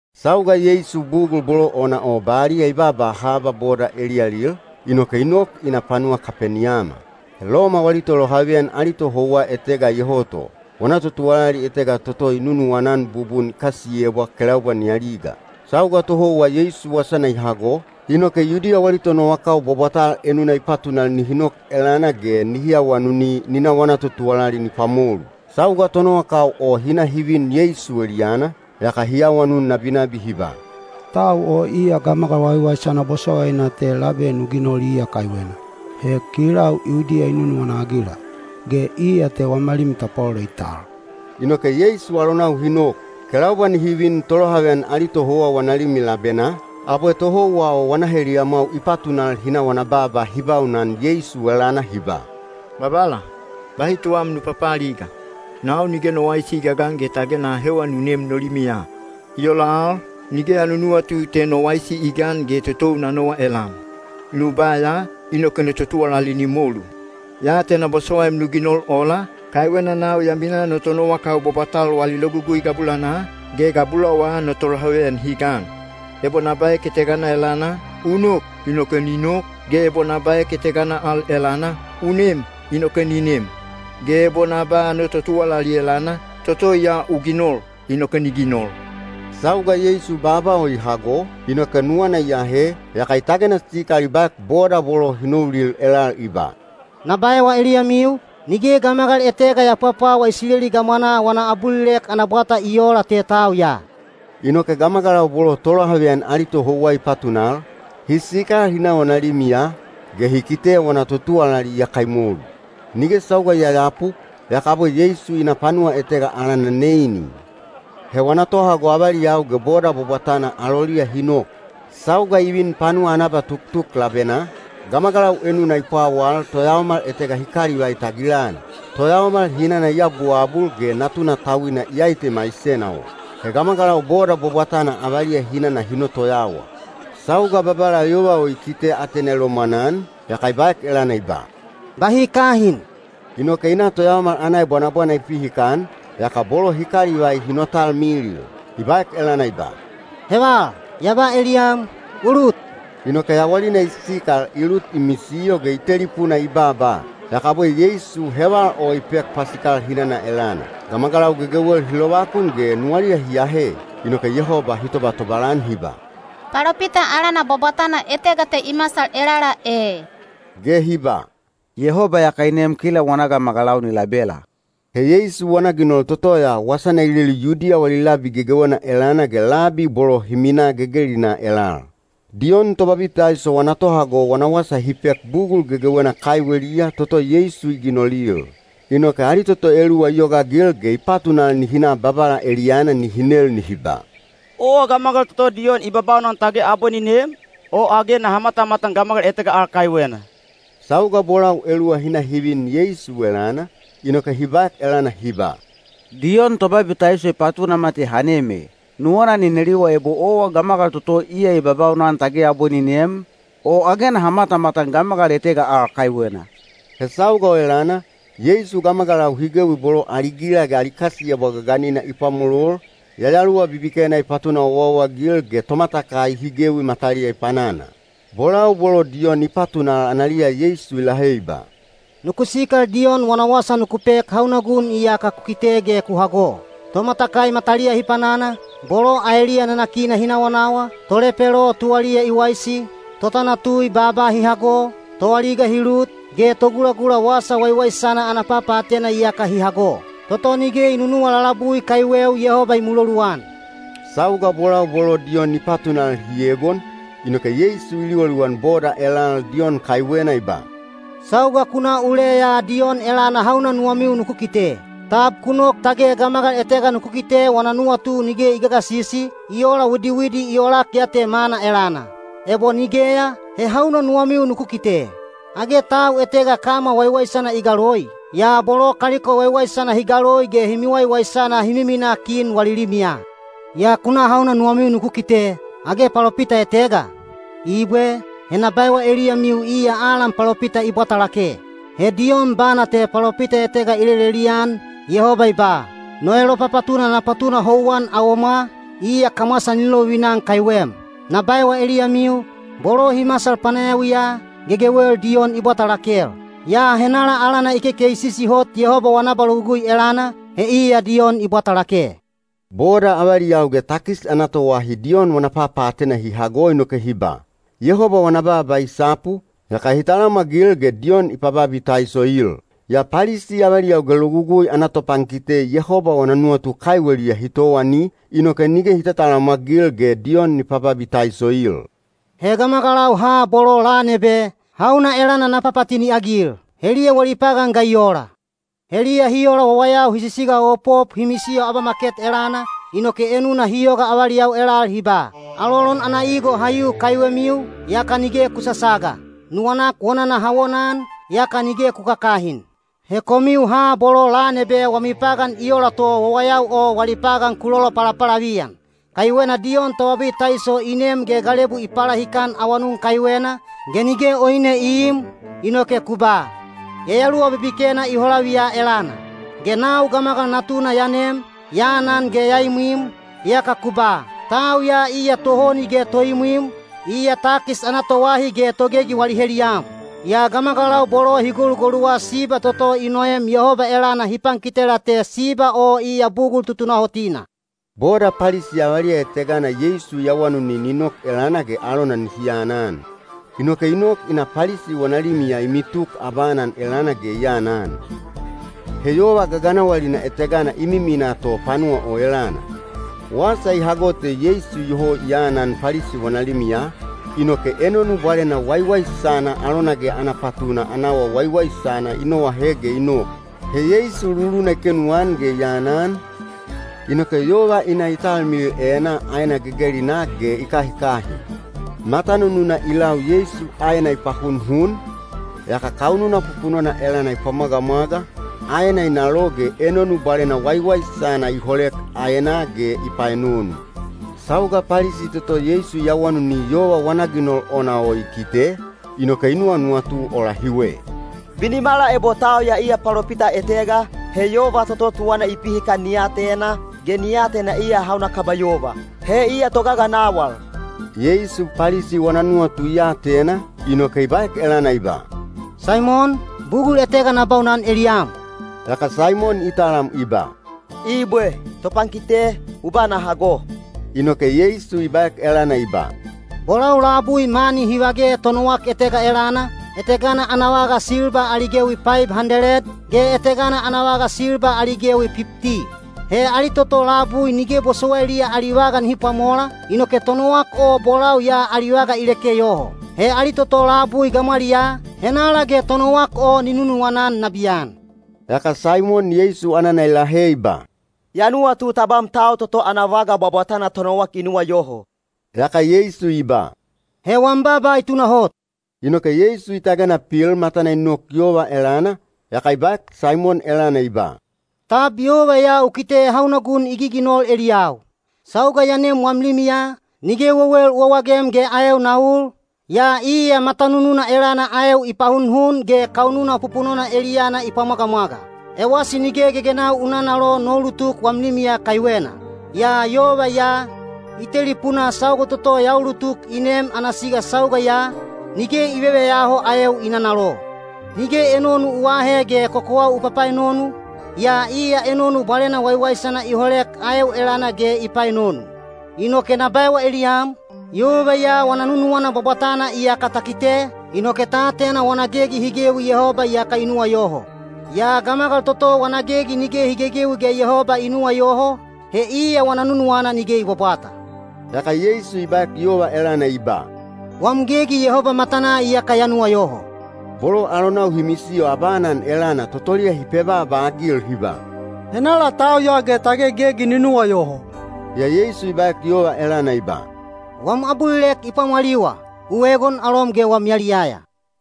Sauga Yeisu bugul bolo ona o baliya i baaba haba boda eliyalil, inoke i nok i na panuwa Kapeniyama. He Loma wali tolohaveyan ali tohouwa etega iyoho to. Wana totuwalali etega toto i nunuwana-an bubun i kasiyebwa kelaubwa ni aliga. Sauga tohouwa Yeisu wasana i hago, inoke Yudiya wali tonowakau bwabwatal enuna i patunal nihi nok elana ge nihi awanuni ni na wana totuwalali ni pwamolu. Sauga tonowakau o hi na hi vin Yeisu eliyana, yaka hi awanun nabinabi hi ba, “Tau o iya gamagal waiwaisana bosowaina te labe nu ginol iya kaiwena. He kilau Yudiya i nunuwana-agila, ge iya te wama limi tapwalolo i tal.” Inoke Yeisu alonau hi nok. Kelaubwa nihi vin tolohaveyan ali tohouwa wana limi labenaa, abwe tohouwa o wana heliyamwau i patunal hi na wana baaba hi baunan Yeisu elana hi ba, “Babala, bahi tuwam nu papaaliga. Nau nige no waisi i gagan ge tage na ahewa nu nem no limiya. I ola al, nige ya nunuwatu te no waisi i gan ge totou na nowa elam. Nu ba ya, inoke no totuwalali ni molu. Ya atena bosowaim nu ginol ola, kaiwena nau ya minaa no tonowakau bwabwatal wali logugui gabulanaa, ge gabulawa no tolohaveyan hi gan. Ebo na baek etegana elana, ‘U nok’ inoke ni nok, ge ebo na baek etegana al elana, ‘U nem’ inoke ni nem. Ge ebo na ba no totuwalali elana, ‘Toto ya u ginol’ inoke ni ginol.” Sauga Yeisu baaba o i hago, inoke nuwana i ahe, yaka i tagena sikal i baek boda bolo hi noulil elal i ba, “Na baewa eliyamiu, nige gamagal etega ya pwapwawa Isileli gamwanaa wana abulilek ana bwata i oola te tau ya.” Inoke gamagalau bolo tolohaveyan ali tohouwa i patunal, hi sikal hi na wana limiya, ge hi kite wana totuwalali iyaka i molu. Nige sauga i yayapu, yaka abwe Yeisu i na panuwa etega alana Neini. He wana tohago avaliyau ge boda bwabwatana aloliya hi nok. Sauga i vin panuwa ana abatuktuk labenaa, gamagalau enuna i pwawal toyaomal etega hi kalivai tagilan. Toyaomal hinana i abuabul ge natuna tauina iyai te maisena o. He gamagalau boda bwabwatana avaliya hinana hi notoyawa. Sauga Babala yova o i kite atena i lomwanan, yaka i baek elana i ba, “Bahi kahin.” Inoke i na toyaomal ana ebwanabwana i pihikan, yaka bolo hi kalivai hi notalmilil. I baek elana i ba, “Heval! Ya ba eliyam, u lut!” Inoke yawalina i sikal i lut i misiyo ge i telipuna i baaba. Yaka abwe Yeisu heval o i pek pasikal hinana elana. Gamagalau gegewel hi lovakun ge nuwaliya hi ahe. Inoke Yehoba hi tobatobal-an hi ba, “Palopita alana bwabwatana etega te i masal elala e,” ge hi ba, “Yehoba iyaka i nem kila wana gamagalau ni labela.” He Yeisu wana ginol toto ya wasana i lelu Yudiya wali labi gegewena elana ge labi bolo hi minaa gegelinaa elal. Diyon Tobabitaiso wana tohago wana wasa hi pek bugul gegewena kaiweliya toto Yeisu i ginolil. Inoke ali toto eluwa i yogaagil ge i patunal nihi na Babala eliyana nihi nel nihi ba, “Owa gamagal toto Diyon i babaunan tage abwe ni nem, o age naha matamatan gamagal etega al kaiwena?” Sauga bolau eluwa hi na hi vin Yeisu elana, inoke hi baek elana hi ba, “Diyon Tobabitaiso i patunama te ha nem e, nuwana ni neliwa ebo owa gamagal toto iya i babaunan tage abwe ni nem, o age naha matamatan gamagal etega al kaiwena.” He sauga o elana, Yeisu gamagalau hi gewi bolo ali gila ge ali kasiyebwa gaganina i pwamolol, yayaluwa bibikena i patuna owaowa-agil ge tomatakai hi gewi mataliya i panana. Bolau bolo Diyon i patunal analiya Yeisu i lahe i ba, “Nuku sikal Diyon wana wasa nuku pek hauna gun iyaka ku kite ge ku hago: tomatakai mataliya hi panana, bolo aeliya nanakina hi nawanawa, tolepelo tuwaliya i waisi, totanatui baaba hi hago, toaliga hi lut, ge togulagula Wasa Waiwaisana ana papaatena iyaka hi hago. Toto nige i nunuwa lalabui kaiweu Yehoba i muloluan.” Sauga bolau bolo Diyon i patunal hi egon, inoke Yeisu i liwaliwan boda elal Diyon kaiwena i ba, “Sauga ku na uleya Diyon elana hauna nuwamiu nuku kite? Tab ku nok tage gamagal etega nuku kite wana nuwatu nige i gagasisi, i ola widiwidi i olak ya te mana elana? Ebo nigeya, he hauna nuwamiu nuku kite? Age tau etega kama waiwaisana i galoi? Yaa bolo kaliko waiwaisana hi galoi ge hi miwaiwaisana hi miminaa kin wali limiya. Yaa ku na hauna nuwamiu nuku kite? Age palopita etega? Ibwe! He na baewa eliyamiu iya alan palopita i bwata lake. He Diyon bana te palopita etega i lelelian, Yehoba i ba: No elopapatuna na patuna houwan awomwa, iya kamwasa ni lovivina-an kaiwem. Na baewa eliyamiu, bolo hi masal panayawiya, gegewel Diyon i bwata lakel. Yaa henala alana i kekeisisi hot Yehoba wana abalogugui elana, he iya Diyon i bwata lake. “Boda avaliyau ge takis ana toahi Diyon wana papaatena hi hago inoke hi ba, ‘Yehoba wana baaba i sapu,’ yaka hi talamwagil ge Diyon i pababitaisoil. Yaa Palisi avaliyau ge logugui ana topankite Yehoba wana nuwatu kaiweliya hi towani, inoke nige hi tatalamwagil ge Diyon ni pababitaisoil. “He gamagalau ha bolo lan ebe, hauna elana na papatini-agil? Heliya wali pagan ga i ola? Heliya hi ola wawayau hi sisigaopop hi misiyo abamaket elana, inoke enuna hi yoga avaliyau elal hi ba: Alolon ana igo ha yu kaiwemiu, yaka nige ku sasaga. Nuwanak wonana ha wonaan, yaka nige ku kakahin. He komiu ha bolo lan ebe wami pagan i ola to wawayau o wali pagan ku lolopalapalaviyan. Kaiwena Diyon Tobabitaiso i nem ge galebu i palahikan awanun kaiwena, ge nige oine i iim, inoke ku ba, ‘Yayaluwa bibikena i holaviya elana.’ Ge nau Gamagal Natuna ya nem, ya anan ge ya imwim, yaka ku ba, ‘Tau ya iya tohoni ge toimwim, iya takis ana toahi ge togegi wali heliyam.’ Yaa gamagalau bolo hi golugoluwa siba toto i noem Yehoba elana hi pankitela te siba o iya bugul tutunahotina.” Boda Palisi avaliya etegana Yeisu i awanuni ni nok elana ge alona nihi anan. Inoke i nok i na Palisi wana limiya i mituk abaanan elana ge i anan. He yova gaganawalina etegana i miminaa to panuwa o elana. Wasa i hago te Yeisu iyoho i anan Palisi wana limiya, inoke enonu bwalena waiwaisana alona ge ana patuna ana awa waiwaisana i noahe ge i nok. He Yeisu luluna i kenuan ge i anan, inoke yova i na i talmilil enaa aena gegelinaa ge i kahikahin. Matanununa i lau Yeisu aena i pahunhun, yaka kaununa pupunona elana i pwamwagamwaga, aena i nalo ge enonu bwalena waiwaisana i holek aenaa ge i paenonu. Sauga Palisi toto Yeisu i awanuni yova wana ginol ona o i kite, inoke i nuwanuwatu ola hiwe: “Binimala ebo tau ya iya palopita etega, he yova toto tuwana i pihikan ni atena, ge ni atena iya hauna kaba yova. He iya togaganawal.” Yeisu Palisi wana nuwatu i atena, inoke i baek elana i ba, “Saimon, bugul etega na baunan eliyam.” Yaka Saimon i talam i ba, “Ibwe. Topankite, u ba na hago.” Inoke Yeisu i baek elana i ba, “Bolau labui mani hi vage tonowak etega elana, etegana ana vaga silba ali gewi paib handeled, ge etegana ana vaga silba ali gewi pipti. He ali toto labui nige bosowailiya ali vaga nihi pwamola, inoke tonowak o bolau ya ali vaga i leke yoho. He ali toto labui gamwaliyaa, henala ge tonowak o ni nunuwana-an nabiyan?” Yaka Saimon Yeisu anana i lahe i ba, “Ya nuwatu tabam tau toto ana vaga bwabwatana tonowak i nuwayoho.” Yaka Yeisu i ba, “He wam baaba i tunahot.” Inoke Yeisu i tagena pil matana i nok yova elana, yaka i baek Saimon elana i ba, “Tab yova ya u kite hauna gun i giginol eliyau? Sauga ya nem wam limiya, nige wewel u wawagem ge aeu na ul, yaa iya matanununa elana aeu i pahunhun ge kaununa pupunona eliyana i pwamwagamwaga. Ewasi nige gegenau u nanalo no ulutuk wam limiya kaiwena. Yaa yova ya, i telipunaa sauga toto ya ulutuk i nem ana siga sauga ya, nige i veveyaho aeu i nanalo. Nige enonu u aahe ge kokowau u papaenonu, yaa iya enonu bwalena waiwaisana i holek aeu elana ge i paenonu. Inoke na baewa eliyam, yova ya wana nunuwana bwabwatana iyaka ta kite, inoke ta atena wana gegi hi gewi Yehoba iyaka i nuwayoho. Yaa gamagal toto wana gegi nige hi gegewi ge Yehoba i nuwayoho, he iya wana nunuwana nige i bwabwata.” Yaka Yeisu i baek yova elana i ba, “Wam gegi Yehoba matanaa iyaka ya nuwayoho.” Bolo alonau hi misiyo abaanan elana totoliya hi pebaaba-agil hi ba, “Henala tau ya ge tage gegi ni nuwayoho?” Yaa Yeisu i baek yova elana i ba, “Wam abulilek i pwamwaliwa. U egon alom ge wam yaliyaya.”